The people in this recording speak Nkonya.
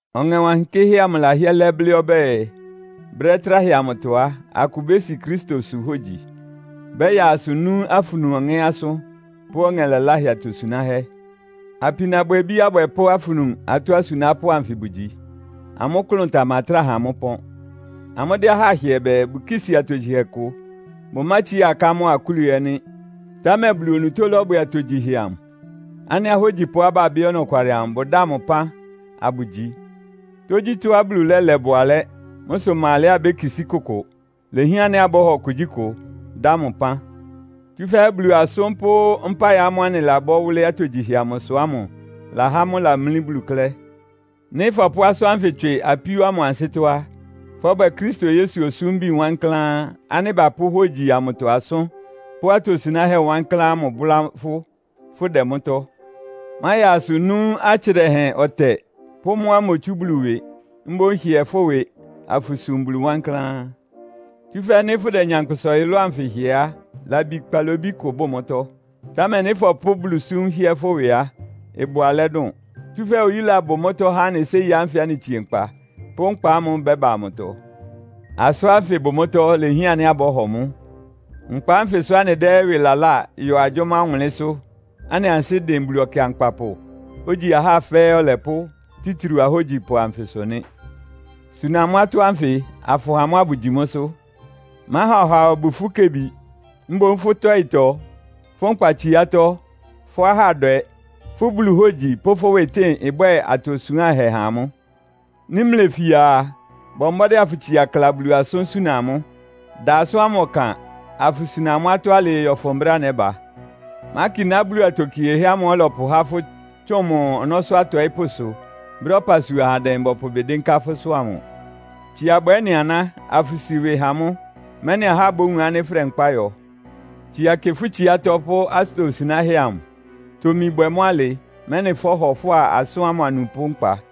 Ɔŋɛ Wankɩ́hɛ́ amʋ lahɩ́ɛ́ lɛ́ blɩ́ ɔbɛ́ɛ, brɛ́ tráhɛ amʋtɔ á, akʋ bési Kristosʋ hógyi. Bɛ́yaa asʋ nú afunu ɔŋɛ́ asʋ́n pʋ́ ɔŋɛ laláhɛ atosunáhɛ́. Apinabwɛbí abwɛpʋ́ afunu atɔ́ asunápʋ́ anfɩ bʋgyi. Amʋ́ klʋn tamatráa ha amʋ́ ɩpɔ́n. Amʋ́dɛ́ ahá hɩɛ bɛɛ, bʋkísi atogyihɛ kʋ, bʋmátsiá aká mʋ́a akúlu ɛ́ nɩ́. Támɛ Bulu onutó lɔ́bwɛ atogyihɛ amʋ, ánɩ́ ahógyipʋá babɩ́ ɔnɔkwalɩ amʋ bʋdáa mʋ ɩpán, abʋgyi. Tógyítɔ́á Bulu lɛ́lɛ bʋ alɛ́. Mʋ́ sʋ ɩma alɛá abékisí kʋkʋ. Ilehián ánɩ́ abɔ́hɔ kugyíkʋ, dá mʋ ɩpán. Tsúfɛ́ Bulu asʋ́n pʋ́ mpáɩ ámʋ́ʋ́ anɩlabɔ́ wʋ́lɩ́ atogyihɛ amʋsʋ ámʋ lahá mʋ́ lamlí Bulu klɛ́. Nɩ́ fɔpʋ́ asʋ́n ánfɩ tswɩ apíó ámʋ ansɩ́tɔ́ á, fɔ́bwɛ Kristo Yesu osúmbi wankláán ánɩ́ bapʋ́ hógyi amʋtɔ asʋ́n, pʋ́ atosunáhɛ́ wankláán ámʋ bʋ́lá fʋ́, fʋdɛ mʋ́tɔ́. Máyaa asʋ nú atsɩ dɛhɛn ɔtɛ pʋ́ mʋ́á imotsú Bulu ɩwɩ. Mboún hɩɛ fʋ́ ɩwɩ, afʋsum Bulu wankláán. Tsúfɛ́ nɩ́ fʋ́dɛ nyankpʋsa ɔyʋlʋ́ʋ anfɩ hɩɛ á, labi kpalobí kʋ bʋ mʋ́tɔ́. Támɛ nɩ́ fɔpʋ́ Bulusúm hɩ́ɛ́ fʋ́ ɩwɩ á, ɩbʋ alɛ́ dʋn. Tsúfɛ́ oyúla bʋ mʋ́tɔ́ há anɩ séi ánfɩ anɩtsie nkpa, pʋ́ nkpa ámʋ́ʋ́ ɩbɛ́ba amʋtɔ. Asʋ́n ánfɩ bʋ mʋ́tɔ́, ilehián ánɩ́ abɔ́hɔ mʋ́. (Nkpa ánfɩ sʋ́ anɩdɛ́ ɩwɩ laláa yɔ agyʋ́má ɔwʋnlɩ́nsʋ́), anɩ ansɩ́ dɩn Bulu Ɔkɩankpapʋ, ogyi ahá fɛ́ɛ́ Ɔlɛpʋ́, títriu ahógyipʋ anfɩsʋ nɩ́. Suna amʋ́ atɔ́ ánfɩ, afʋha amʋ́ abʋgyi mʋ́sʋ́. Máha ɔhaa obu fʋ́ kebi. Mboún fʋ́ tɔ́ɩtɔ, fʋ́ nkpatsiátɔ́, fʋ́ ahádwɛ, fʋ́ Bulu hógyi pʋ́ fʋ́ ɩwɩtɩ́ɩn ɩbwɛ́ɛ atosuánhɛ ha amʋ́. Nɩ́ mlefia a, bɔ mbɔ́dɩ́ afʋtsia kla Bulu asʋ́n suna amʋ́. Da asʋ́n ámʋ ɔkan, afʋsuna amʋ́ atɔ́ alɩɩ yɔ́fʋn brɛ́á nɛ́ba. Mákiná Bulu atokiehɛ́ ámʋ́ʋ́ ɔlɔpʋhá fʋ́ tsʋn mʋ ɔnɔ́sʋ́ atɔɩ́pʋ́sʋ, brɛ́á ɔpasua ahandɛ bɔpʋ ɩbɩ dɩ́nká fʋ́sʋ́ amʋ. Tsia bwɛ ɩ́nɩ aná, afʋsi ɩwɩ ha mʋ́, mɛ́nɩ ahá bówun ánɩ́ fʋ́dɛ nkpá yɔ. Tsia kɩ fʋ́ tsiátɔ́ pʋ́ atosunáhɛ́ amʋ. Tomi bwɛ mʋ́ alɩ, mɛ́nɩ fɔ́hɔ fʋ́a asʋ́n ámʋ anupʋ́ nkpa.